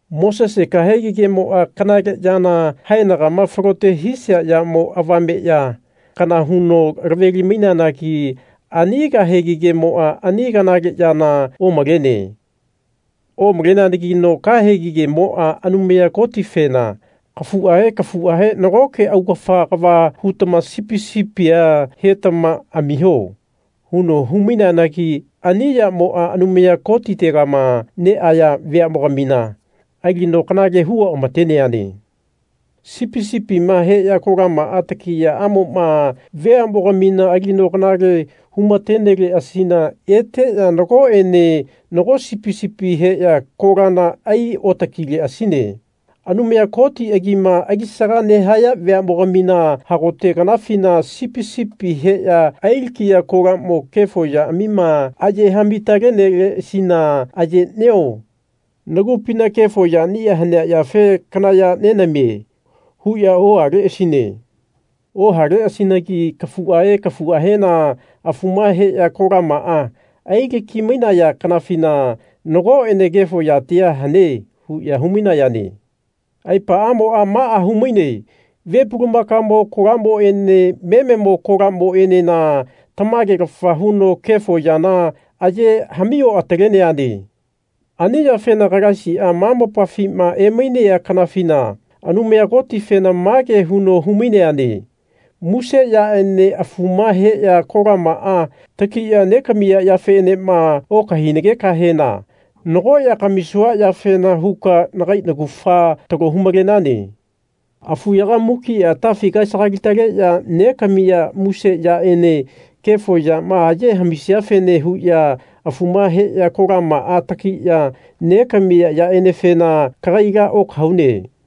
Mosese kahegi kemoa kanale yana haenagama falote hisia yamo avame ya kana huno laveli-maineanagi ani kahegi kemoa ani kanale yana omalene. Omaleneanagino kahegi kemoa Anumaya Kotifena kafuahe kafuahe nagoke augafa kava hutama sipi sipia hetama amiho. huno hu-maineanagi ani yamoa Anumaya Kotitegama neaya veamogamina alino kanale hu oamateneane. Sipi sipima heya kolamaa takiyaamoma veamogamina alino kanale humateneleasina eteya nagoenena nago sipi sipia heya kolana ai otakileasine. Anumaya Koti agima alisaga nehaya veamogamina hagote kanafina sipi sipi heya ailakiya kolamo kefo yaamima ayehami-taleneleasina Ayenio nagupina kefo yania hanea yafe kana ya nenamie. huya ohaleasine. Ohaleasinagi kafuahe kafuahena afuma heya kolamaa ailaki-mainaya kanafina Nagoene kefo yatia hane. huya hu-mainayane. Aepaamoa maa humaine ve pulamakamo kolamoene mememo kolamoenena tamagelafa huno kefo yana aye hami oataleneane. Ani yafena Kalaisia ma mopafima emainea kanafina Anumaya Kotifena mage huno hu-maineane Muse yaene afuma heya kolamaa takiya negamiya yafeenema okahainagenahena nago ya kamisua yafene huka nagai naugafa talo hu-malenane. Afuyaga mukia atafi kaesagali-taleya negamiya muse yaene kefo yama aye hamisiafene huya afuma heya kolamaa takiya negamiya yaenefena kagaila okahaune.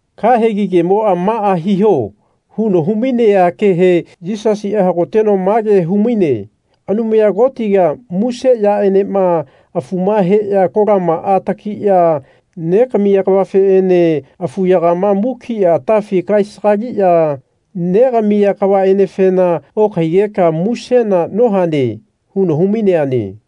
Kahegi kemoa Maa hiho. huno humainea kehe Yisasia hagoteno mage humaine Anumaya Kotiga muse yaenema afuma heya kolamaa takiya negamiya kavafeene afuyagama mukia atafi kaesagaliya negamiya kavaenefena okahaigeka musena nohane. huno humaineane.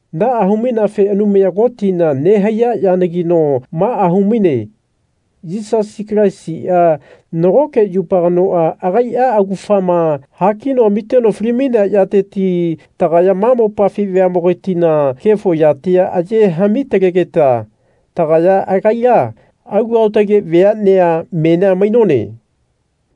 Naa hu-maineafe Anumaya Kotina nehaiya yanagino, maa humaine Yisasi Kalaisia nagoke yupa kanoa agaia augafama hakino amiteno fali-mainea yateti tagaya ma mopafi veamogatina kefo yatia aye hami-talegeta tagaya agaila alu aotage veanea menia mainone.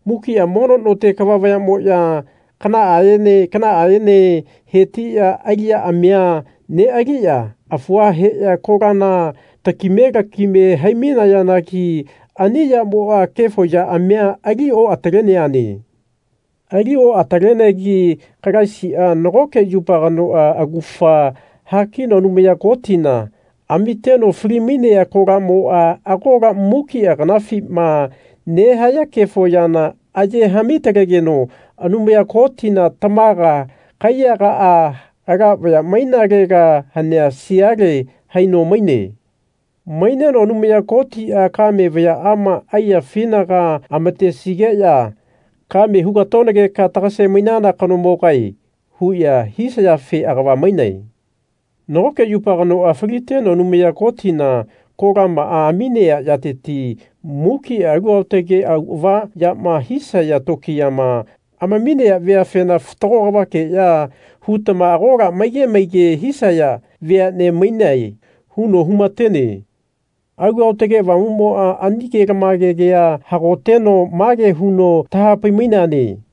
Mukia mono note kava vayamoya kanaaene kanaaene hetiya aliyaamia nealiya afua heya kolana takime lakime hai-mainayanagi ani yamoa kefo yaamia ali oataleneane. Ali oatalenegi Kalaisia nagoke yupa kanoa augafa hakino Anumaya Kotina amiteno fali-mainea kolamoa agola mukia kanafima nehaya kefo yana aye hamitalegeno Anumaya Kotina tamaga kaiyagaa ala vaya mainalega hanea siale haino maine. Maineno Anumaya Kotia kame vayaama aiyafinaga amatesigeya Kame hugatonageka tagase-mainana kanomogae. huya hisayafe agava maine. Nagoke yupa kanoa faliteno Anumaya Kotina kolamaa aminea yateti mukia alu aotage auava yama hisaya tokiyama amaminea veafena Fatago kavakeya hutama agola maige maige hisaya veane mainae. huno humatene. Alu Aotage Avamumoa ani kelamage kea hagoteno mage huno tahapai-maine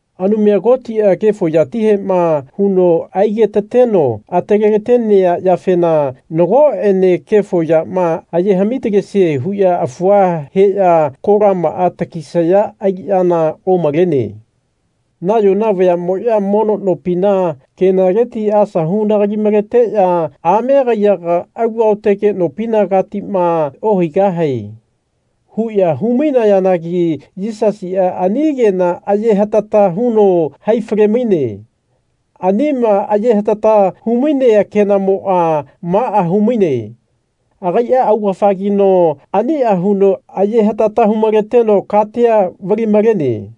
Anumaya Kotia kefo yatihema huno aigetateno atalelatenea yafena nagoene kefo yama aye hamitalesie huya afua heya kolamaa takisaya aliyana omalene. Nayona vayamoya mono nopina kenaleti asa hunalagi-maleteya Ame kaiyaga alu aotage nopinagagitama ohaigahae. huya hu-mainayanagi Yisasia ani kena aye hatata huno hai fale-maine. Anima aye hatata humainea kenamoa maa humaine. Agaia augafagino ania huno aye hatata hu-maleteno katia vali-malene.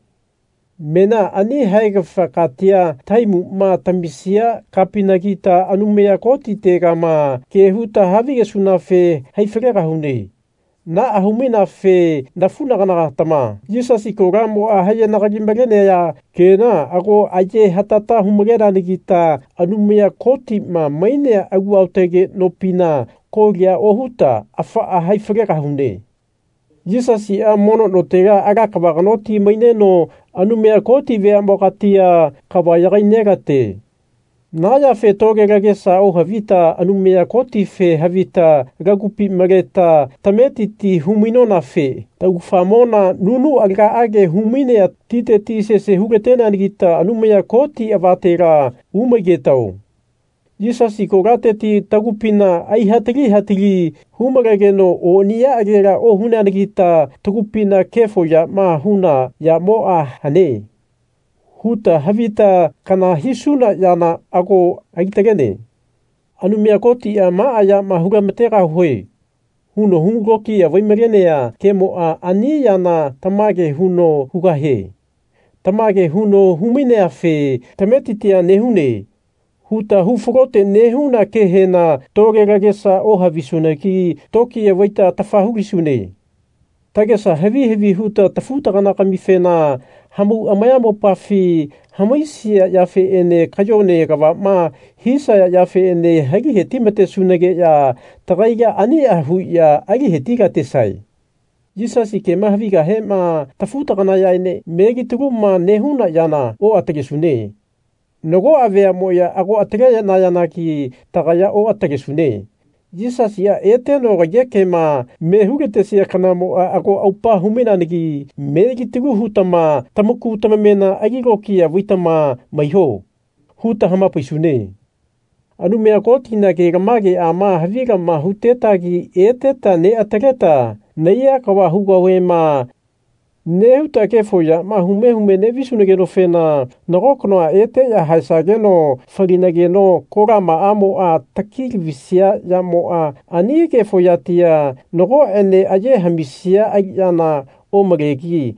Menia ani haegafa katia tahaimuma tamisia kapinagita Anumaya Kotitegama ke huta havigesunafe hai falegahune. Naa hu-maineafe nafunagana-gatama Yisasi kolamoa ayenalagi-malenaya kena ago ayehatata hu-maleneanagita Anumaya Kotima mainea alu aotage nopina kolia ohuta afaa hai falegahune. Yisasia mono notela ala kava kanoti maineno Anumaya Koti veamogatia kava yagai nelate. Na yafe tole lagesa ohavita Anumaya Kotife havita lagupi maleta tametiti hu-mainonafe taugafamona nunu alagaage humainea titeti sese hu-lateneanagita Anumaya Koti avatela umaigetao. Yisasi kolateti tagupina aihatali hatali hu-malegeno oniyaagela ohuneanagita tagupina Kefo yama huna yamoa hane. huta havita kana hisuna yana ago ali-talene. Anumaya Kotia Maa yama hu-lamategahue. huno hu lokiya vai-malenea kemoa ani yana tamage huno hugahie. Tamage huno hu-maineafe tametitia nehune. huta hu falote nehuna kehena tole lagesa ohavisunagi tokiya vaita atafa hu-lisune. Tagesa havi havi huta tafu-tagana-gamifena hamau amayamopafi hamaisia yafeene kayone kavama hisaya yafeene ali hetimatesunageya tagaila ania huya ali hetilatesae. Yisasi kema havigahema tafu-taganayaene melitaluma nehuna yana oatalesune. Nagoa veamoya ago atalenayanagi tagaya oatalesune. Yisasia eteno kaiyekema me hulatesia kanamoa ago aupa hu-mainegi melitalu hutama Tamaku tamamena ali lokiya vaitama maiho. huta hamapaisune. Anumaya Kotina kelamageama havilama hutetagi eteta neataleta Nahaiya kava hugahuema. nehuta kefo yama hume hume nevisunagenofena nago kanoa eteya haesageno falinageno kolamaamoa taki lavisia yamoa ani kefo yatia nagoene aye hamisia aliyana omalegi.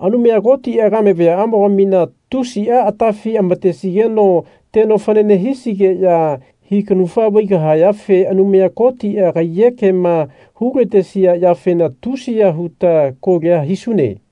Anumaya Kotia kame vayaamogamina tusia atafi amatesigeno teno fanane hisigeya hikanufa vaigahayafe Anumaya Kotia kaiyekema hulatesia yafena tusiya huta kolia hisune.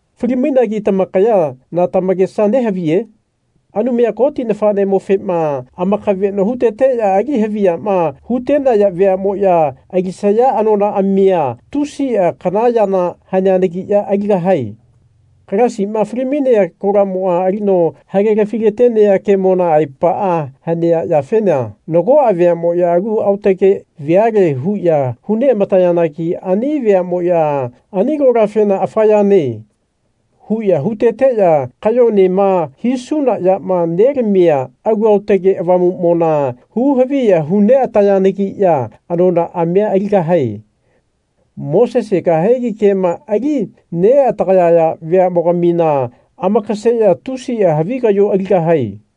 Fali-mainagi tamakaya na tamakesa nehaviye? Anumaya Koti nafanemofema amakaveno huteteya ali haviyama hutenaya veamoya alisaya anonaamia tusia kana yana haneanagiya aligahae. Kalaisima fali-mainea kolamoa alino hagelafi-latenea kemona aepaa hanea yafena nagoa veamoya alu aotage veale huya hu neamatayanagi ani veamoya ani kolafena Afa yane. huya huteteya kayonema hisuna yama nelamia Alu Aotage Avamumona hu-haviya hu neatayanagiya anonaamia aligahae. Mosese kahegi kema ali neatagayaya veamogamina amakaseya tusia havi kayo aligahae.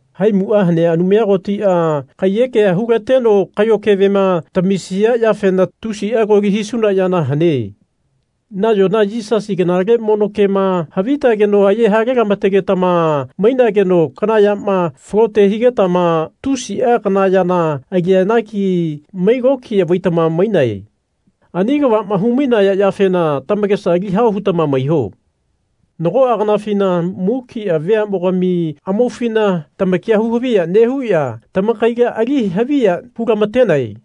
Haimua hanea Anumaya Kotia kaiyekea hulateno kayo kevema tamisia yafena tusia koli hisuna yana hane. Nayona Yisasi kanale mono kema havitageno aye halelamategetama mainageno kana yama falote higetama tusia kana yana aliyanagi mai lokiya vaitama mainae. Ani kavama hu-mainaya yafena tamakesa ali hao hutama maiho. Nagoa kanafina mukia veamogami amaufina tamakia hu-haviya nehuya tamakaila ali haviya hulamatenae.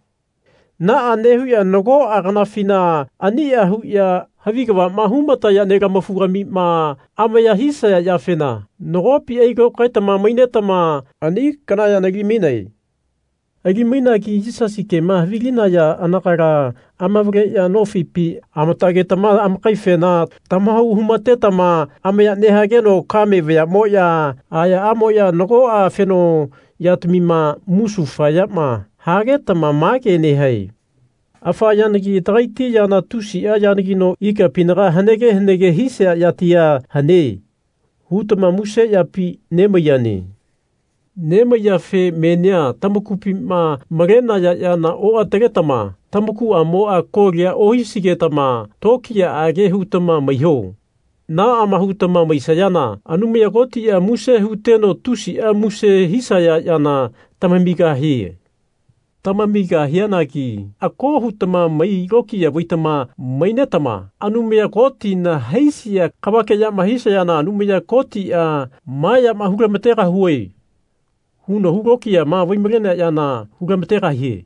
Naa nehuya nagoa kanafina ania huya havi kavama humataya nelamafu-gamima amaya hisaya yafena nagopi ailokaetama mainetama ani kana yana ali-mainae. Ali-mainagi Yisasi kema havilinaya anagala amavaleya nofipi amatagetama amakaifena tamahau humatetama amaya nehageno kame vayamoya ayaamoya nagoa afeno yatamima musufayama hagetama mage nehae Afa yanagi tagaiti yana tusia yanagino ikapinaga hanege hanege hisia yatia hane. hutama muse yapi nemaiyane. Nemaiyafe menia tamakupima malenaya yana oataletama tamakuamoa kolia ohisigetama tokiyaage hutama maiho. Naama hutama maisayana Anumaya Kotia muse huteno tusia muse hisaya yana tamamigahie. Tamamigahianagi ako hutama mai lokiya vaitama mainetama Anumaya Kotina haisia kavakeyama hisayana Anumaya Kotia Ma yama hulamategahue. huno hu lokiya vai-malenea yana hulamategahie.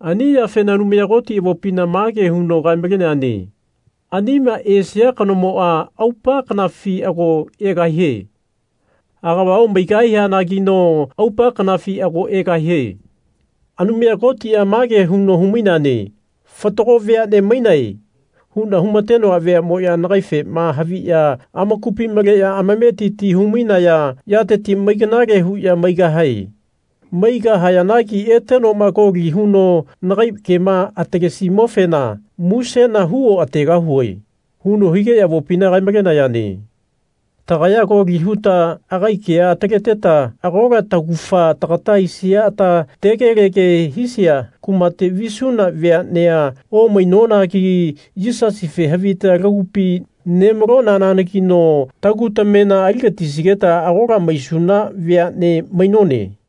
Ani yafena Anumaya Koti avopina mage huno kae-maleneane Anima esia kanomoa aupa kanafi ago egahie. Agava omaigahianagino aupa kanafi ago egahie. Anumaya Kotia mage huno hu-maineane Fatago veane mainae. huna humatenoa veamoya nagaifema haviya amakupi maleya amametiti hu-mainaya yateti mai kanale huya maigahae. Maigahayanagi etenoma koli huno nagai kema atalesimofena musena hu oategahue. huno higeya avopina kae-malenayane. Tagaya koli huta agai kea ataleta agola taugafa tagata aisia ata tegelege hisia kumate visuna veanea omainonagi Yisasife havita lagupi nemalonanagino tagu tamena aligatisigeta agola maisuna veane mainone.